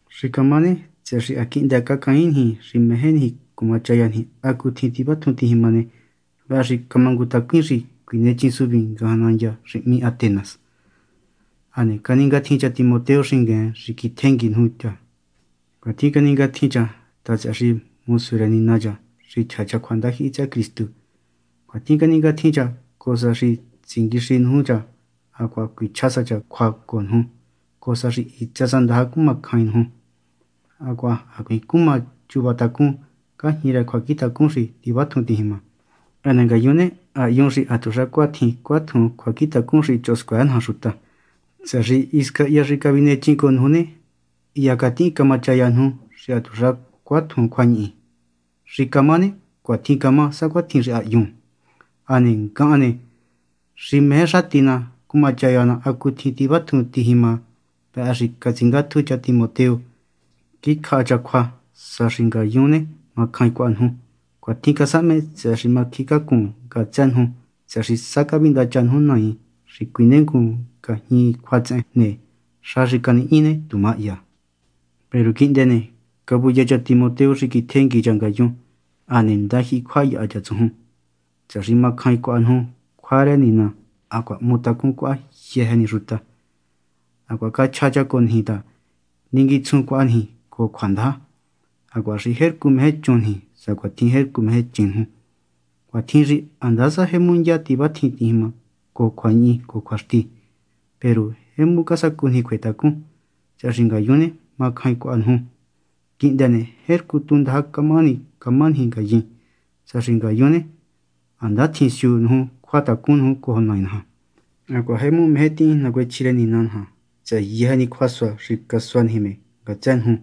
Xi camá ne, tsëhë xi ha quihndë cacain niji xi meje niji cumachaya niji hacutjin tivatjun tijima ne, vëhë xi camangutacuin xi cuinechin suvin ngajan nandya xi hmí Atenas. Hane caningatjin cha Timoteo xingueen xi quiji tjengui cha ngayun. Cuatjin caningatjin cha ta, tsëhë xi mosu rë Nina cha, xi chja cha cjua ndajyihi tsëhë Cristu. Cuatjin caningatjin cha, cojo sa xi tsinguixi nuju cha hacuaha cuichja sa cha cjua cojo nuju, cojo sa xi hitsë sa ndaja cumacjain nuju hacuaha hacuiin cuma chuva tacún ngajñi rë cjuacjintacun xi tivatjun tijima. Hane ngayun ne, ha hyun xi hatuxa cuatjin cuatjuun cjuacjintacun xi choho scuëë naja xuta, tsëhë xi hisca hya xi cavinechin cojo nuju ne, hya catihin camachaya nuju xi hatuxa cuatjun cjuañihi. Xi camá ne, cuatjin camá, sacuatjin xi ha hyun. Hane ngahan ne, xi meje xati ná cumachaya ná hacutjin tivatjun tijima, vëhë xi catsingátju cha Timoteo, quiji cjaha cha cjua sa xi ngayun ne, macjain cuaha nuju. Cuatjin casahme, tsëhë xi camacjíncácun ngatsë nuju tsëhë xi sa cavindacha nuju naain xi cuinengun ngajñi cjuatsehen ne, xa xi canihñi ne, tu mahya. Peru quihndë ne, cavuya cha Timoteo xi quiji tjengui cha ngayun. Hane ndajyihi cjua yaha cha tsujun, tsëhë xi macjain cuaha nuju cjua rë Nina hacuaha hmutacun cuaha yëjë ni xuta. Hacuaha cachja cha cojo niji ta ninguitsjun cuaha niji cojo cjuandaja, hacuaha xi jercu meje chun niji sacuahatjin jercu meje chin nuju. Cuatjin xi handasa jemu ndya tivatjin tijima cojo cjuañihi cojo cjuaxti, peru jemu casacu niji cjuetacun, tsëhë xi ngayun ne, macjain cuaha nuju. Quihndë ne, jercu tu ndaja camahani cuma niji ngayin, sa xi ngayun ne, ha ndatjin siu nuju cjuatacun nuju cojo Nai naja. Hacuaha jemu meje tihin nacuechji rë Nina naja tsëhë yëjë ni cjuasua xi casua niji me ngatsë nuju.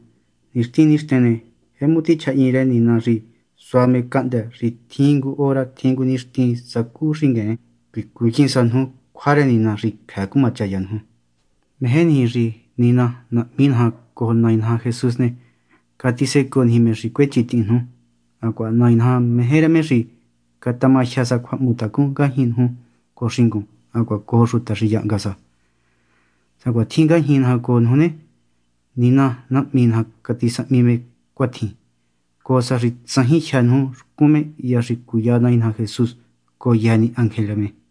Nixtin nixten ne, jemu tichjahyin rë Nina xi sua me cahndë́ xi tjin ngu hora tjin ngu nixtin sacú xingueen ne, cuicuyin sa nuju cjua rë Nina xi cjëë cumachaya nuju. Meje niji xi Nina Nahmi naja cojo Nai naja Jesús ne, catisecoo niji me xi cuechintihin nuju. Hacuaha Nai naja meje rë me xi catamajyë sa cjuahmutacun ngajñi nuju cojo xingun hacuaha cojo xuta xi yahnga sa, sacuatjin ngajñi naja cojo nuju. Nina Nahmi naja catisahmi me cuatjin, cojo sa xi tsajin jyë́ nuju xcun me hya xi cuya Nai naja Jesús cojo yëjë ni ángel rë me.